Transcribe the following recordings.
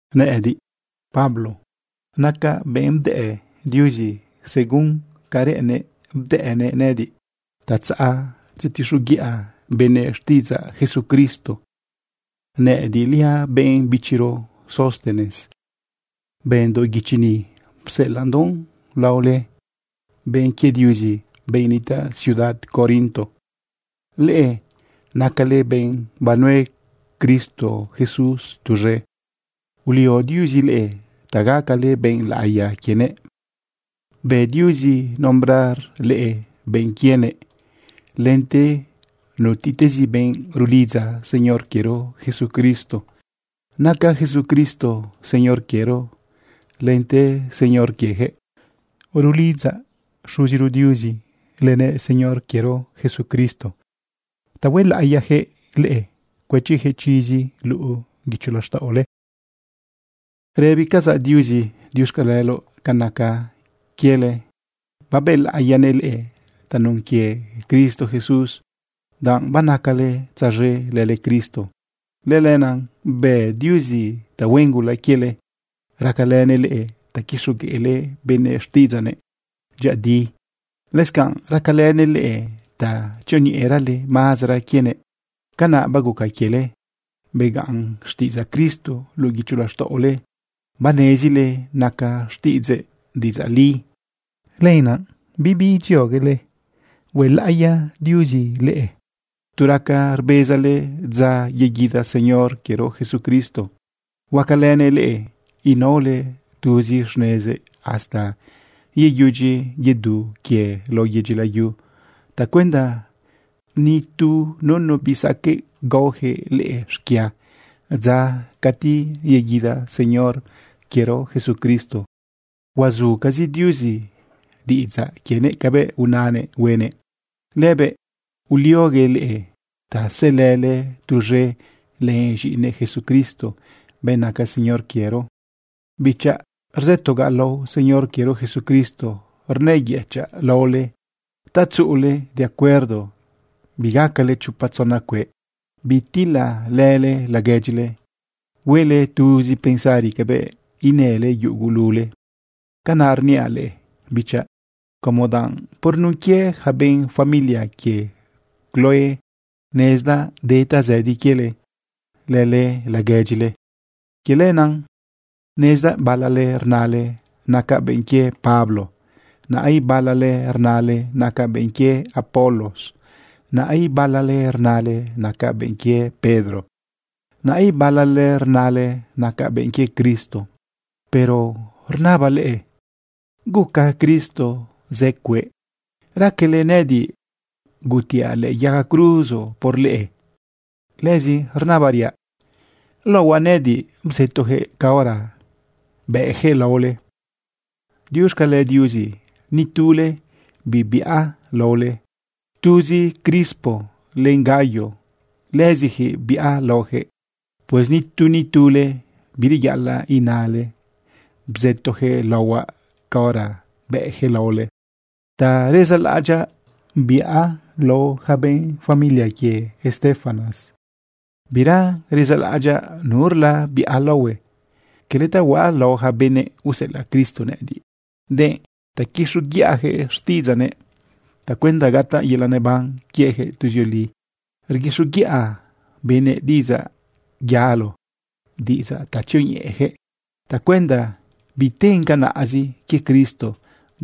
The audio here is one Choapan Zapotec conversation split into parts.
Nëꞌëdiꞌ, Pablo, nacaꞌ benꞌ bdëꞌ Diuzi. Según ca reꞌennëꞌ bdëꞌnëꞌ nëꞌëdiꞌ ta tzaꞌ tzetixoguiꞌa benëꞌ xtiꞌidzaꞌ Jesucristo. Nëꞌëdiꞌliaꞌ benꞌ bichiro Sóstenes bëndoꞌ guichi ni pseꞌelaꞌndoꞌn lao leꞌe, benꞌ quie Diuzi, benꞌ nitaꞌ ciudad Corinto. Leꞌe nacale benꞌ banue Cristo Jesús tuz̃e. Ulio Diuzi leꞌe ta gacale benꞌ laꞌiya quienëꞌ. Bë Diuzi nombrar leꞌe benꞌ quienëꞌ lente nutiꞌtezi benꞌ rulidza Señor quiero Jesucristo. Naca Jesucristo Señor quiero lente Señor quieyaquëꞌ. Rulidzaꞌ Xuziro Diuzi lënëꞌ Señor quiero Jesucristo ta huelaꞌiyaquëꞌ leꞌe, cuëchiyaquëꞌ chizi luꞌu guicho laxtaꞌole. Rëbicazaꞌ Diuzi diuxcaleloꞌ ca naca quiele babëlaꞌiyanëꞌ leꞌe tanun quie Cristo Jesús. Danꞌ banacale tzaz̃e lële Cristo, lëlenaꞌ bë Diuzi tahuen gula quiele, racalënëꞌ leꞌe ta quixogueꞌle benëꞌ xtiꞌidzaꞌnëꞌ dyëꞌëdi, lëscanꞌ racalënëꞌ leꞌe ta tzioñeꞌerale mazara quienëꞌ. Canaꞌ baguca quiele begaꞌn xtiꞌidzaꞌ Cristo luꞌu guicho laxtaꞌole, banezile naca xtiꞌidzëꞌ diꞌidzaꞌ li. Lëlenaꞌ bibi idzioguele huelaꞌiya Diuzi leꞌe tu raca rbezale dza yeguida Señor quiero Jesucristo. Huacalënëꞌ leꞌe inaole tuzi xnezëꞌ hasta yeyudyi yedu quie lao yedyi layu tacuenda ni tu nunu bisaqueꞌ gaojëꞌ leꞌe xquia dza cati yeguida Señor quiero Jesucristo. Huazucazi Diuzi diꞌidzaꞌ quienëꞌ cabëꞌ unanëꞌ huenëꞌ. Lëbëꞌ ulioguëꞌ leꞌe ta sëlële tuz̃e len z̃iꞌinëꞌ Jesucristo, benꞌ naca Señor quiero. Bichaꞌ, rzëtogaꞌ lao Señor quiero Jesucristo, rnëyëchaꞌ laole ta tzuꞌule de acuerdo, bigacale chopa tzona cueꞌ. Bitilalële laguedyile. Huele tuzi pensari cabëꞌ inële yugulule. Canaꞌ rniaꞌ leꞌe, bichaꞌ, como danꞌ por nun quie yaca benꞌ familia quie Cloé nezdaꞌ de tazëdi quiele lële laguedyile. Quie lenaꞌ nezdaꞌ balale rnale: “Nacaꞌ benꞌ quie Pablo.” Naꞌ ibalale rnale: “Nacaꞌ benꞌ quie Apolos.” Naꞌ ibalale rnale: “Nacaꞌ benꞌ quie Pedro.” Naꞌ ibalale rnale: “Nacaꞌ benꞌ quie Cristo.” Pero rnabaꞌ leꞌe ¿guca Cristo zë cueꞌ? ¿Raquele nëꞌëdiꞌ gutiaꞌ lëꞌë yaga cruzo por leꞌe? Lëzi rnabariaꞌ: ¿Laohuaꞌ nëꞌëdiꞌ bzëtoyaquëꞌ caora bëꞌyaquëꞌ laole? Diuxcale Diuzi nitule bibiꞌa laole. Tuzi Crispo len Gayo, lëziyaquëꞌ biꞌa laoyaquëꞌ. Pues nitu nitule bireyaꞌalaꞌ inale bzëtojëꞌ laohuaꞌ caora bëꞌyaquëꞌ laole. Ta rezalaꞌadyaꞌ biꞌa lao yaca benꞌ familia quie Estéfanas. Bira rezalaꞌadyaꞌ nurla biꞌa laohue. Cala ta huaꞌ lao yaca benëꞌ useꞌelaꞌ Cristo nëꞌëdiꞌ, denꞌ ta quixoguiꞌayaquëꞌ xtiꞌidzaꞌnëꞌ tacuenda gataꞌ yelaꞌ neban quieyaquëꞌ tuzioli. Rguixoguiꞌa benëꞌ diꞌidzaꞌ yalo, diꞌidzaꞌ ta tzioñeꞌeyaquëꞌ tacuenda biten canaꞌzi quie Cristo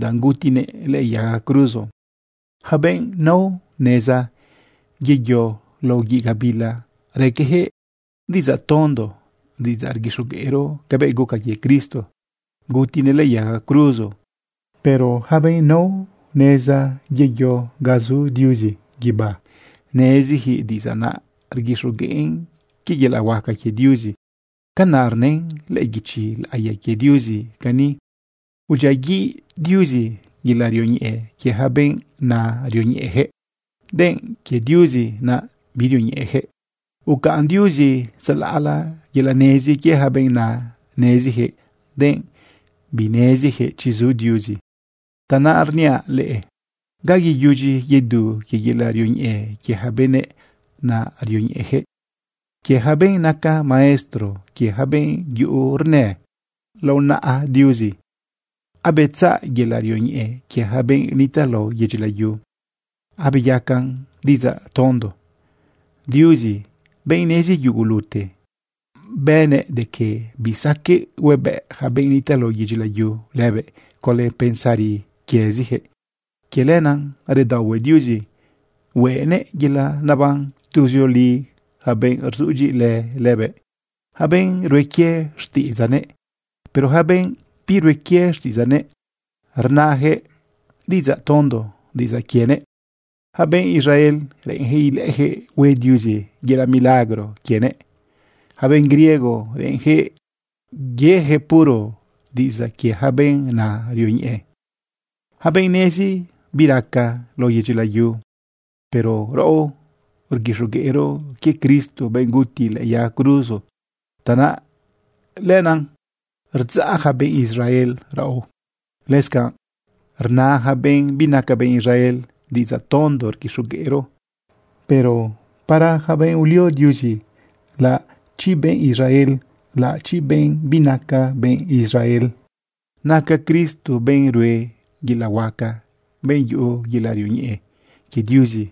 danꞌ gutinëꞌ lëꞌë yaga cruzo. Yaca benꞌ nao neza yeyo lao guiꞌ gabila, raqueyaquëꞌ diꞌidzaꞌ tondo, diꞌidzaꞌ rguixogueꞌro cabëꞌ guca quie Cristo gutinëꞌ lëꞌë yaga cruzo. Pero yaca benꞌ nao neza yeyo ga zu Diuzi guibá, nezijëꞌ diꞌidzaꞌ naꞌ rguixogueꞌn quie yelaꞌ huaca quie Diuzi. Canaꞌ rnën lëꞌë guichi laꞌiya quie Diuzi cani: Udyiaguiꞌ Diuzi yelaꞌ rioñeꞌe quie yaca benꞌ na rioñeꞌeyaquëꞌ, denꞌ quie Diuzi naꞌ birioñeꞌeyaquëꞌ. Ucaꞌn Diuzi tzalaꞌla yelaꞌ nezi quie yaca benꞌ na neziyaquëꞌ, denꞌ bineziyaquëꞌ chi zu Diuzi. Tanaꞌ rniaꞌ leꞌe, ¿ga yeyudyi yedu quie yelaꞌ rioñeꞌe quie yaca benꞌ na rioñeꞌeyaquëꞌ, quie yaca benꞌ naca maestro, quie yaca benꞌ yuꞌu rnë? Lao naꞌa Diuzi abetzaꞌ yelaꞌ rioñeꞌe quie yaca benꞌ nitaꞌ lao yedyi layu, abeyacan diꞌidzaꞌ tondo. Diuzi, benꞌ nezi yugulute, bënëꞌ de que bisaqueꞌ huebëꞌ yaca benꞌ nitaꞌ lao yedyi layu lëbëꞌ conlë pensari quieziyaquëꞌ. Quie lenaꞌ redaohue Diuzi hueꞌnëꞌ yelaꞌ naban tuzioli yaca benꞌ rzudyiꞌilë lëbëꞌ, yaca benꞌ rue quie xtiꞌidzaꞌnëꞌ. Pero yaca benꞌ birue quie xtiꞌidzaꞌnëꞌ, rnayaquëꞌ diꞌidzaꞌ tondo diꞌidzaꞌ quienëꞌ. Yaca benꞌ Israel, reꞌenjëꞌ ilëꞌëjëꞌ hue Diuzi yelaꞌ milagro quienëꞌ. Yaca benꞌ griego, reꞌenjëꞌ yejëꞌ puro diꞌidzaꞌ quie yaca benꞌ na rioñeꞌe, yaca benꞌ nezi biraca lao yedyi layu. Pero raꞌo rguixogueꞌro quie Cristo, benꞌ guti lëꞌë yaga cruzo. Tanaꞌ lenaꞌ rdzaꞌ yaca benꞌ Israel raꞌo, lëscanꞌ rna yaca benꞌ binaca benꞌ Israel diꞌidzaꞌ tondo rguixogueꞌro. Pero para yaca benꞌ ulio Diuzi, laꞌachi benꞌ Israel, laꞌachi benꞌ binaca benꞌ Israel, naca Cristo benꞌ rue yelaꞌ huaca, benꞌ yuꞌu yelaꞌ rioñeꞌe quie Diuzi.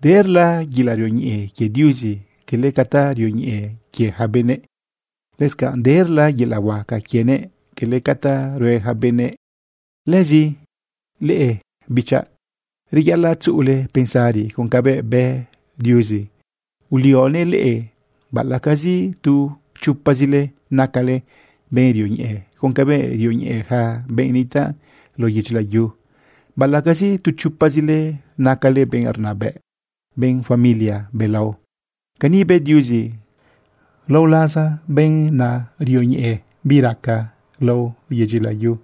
Derla yelaꞌ rioñeꞌe quie Diuzi, cala ca ta rioñeꞌe quie yaca benëꞌ. Lëscanꞌ derla yelaꞌ huaca quienëꞌ, cala ca ta rue yaca benëꞌ. Lëzi leꞌe bichaꞌ, reyaꞌalaꞌ tzuꞌule pensari con cabëꞌ bë Diuzi ulionëꞌ leꞌe baꞌalaꞌcazi tu chopazile nacale benꞌ rioñeꞌe con cabëꞌ rioñeꞌe yaca benꞌ nitaꞌ lao yedyi layu, baꞌalaꞌcazi tu chopazile nacale benꞌ rnabëꞌ, benꞌ familia belao. Cani bë Diuzi, lao laza benꞌ na rioñeꞌe bi raca lao yedyi layu,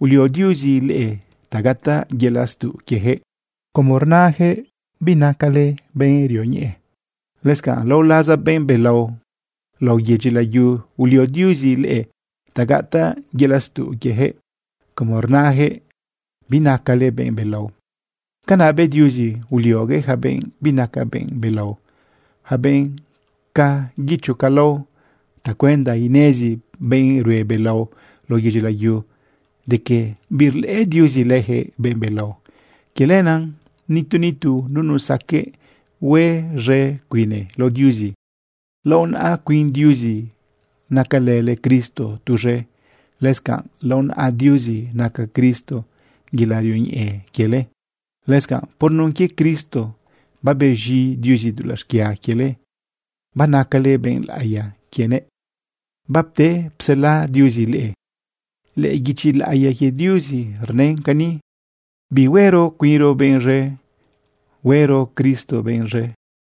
ulio Diuzi leꞌe ta gataꞌ yelaꞌ stuꞌ quieyaquëꞌ como rnayaquëꞌ binacale benꞌ rioñeꞌe. Lëscanꞌ lao laza benꞌ belao lao yedyi layu, ulio Diuzi leꞌe ta gataꞌ yelaꞌ stuꞌ quieyaquëꞌ como rnayaquëꞌ binacale benꞌ belao. Canaꞌ bë Diuzi ulioguëꞌ yaca benꞌ binaca benꞌ belao, yaca benꞌ ca guicho ca lao, tacuenda inezi benꞌ rue belao lao yedyi layu de que birlëꞌë Diuzi leyaquëꞌ benꞌ belao. Quie lenaꞌ nitu nitu nunu saqueꞌ hue z̃e cuine lao Diuzi. Lao naꞌa cuin Diuzi nacalële Cristo tuz̃e. Lëscanꞌ lao naꞌa Diuzi naca Cristo yelaꞌ rioñeꞌe quiele. Lëscanꞌ por nun quie Cristo babez̃i Diuzi dulaꞌ xquia quiele, banacale benꞌ laꞌiya quienëꞌ, bapte psela Diuzi leꞌe. Lëꞌë guichi laꞌiya quie Diuzi rnën cani: Bihuero cuinro benꞌ z̃e, huero Cristo benꞌ z̃e.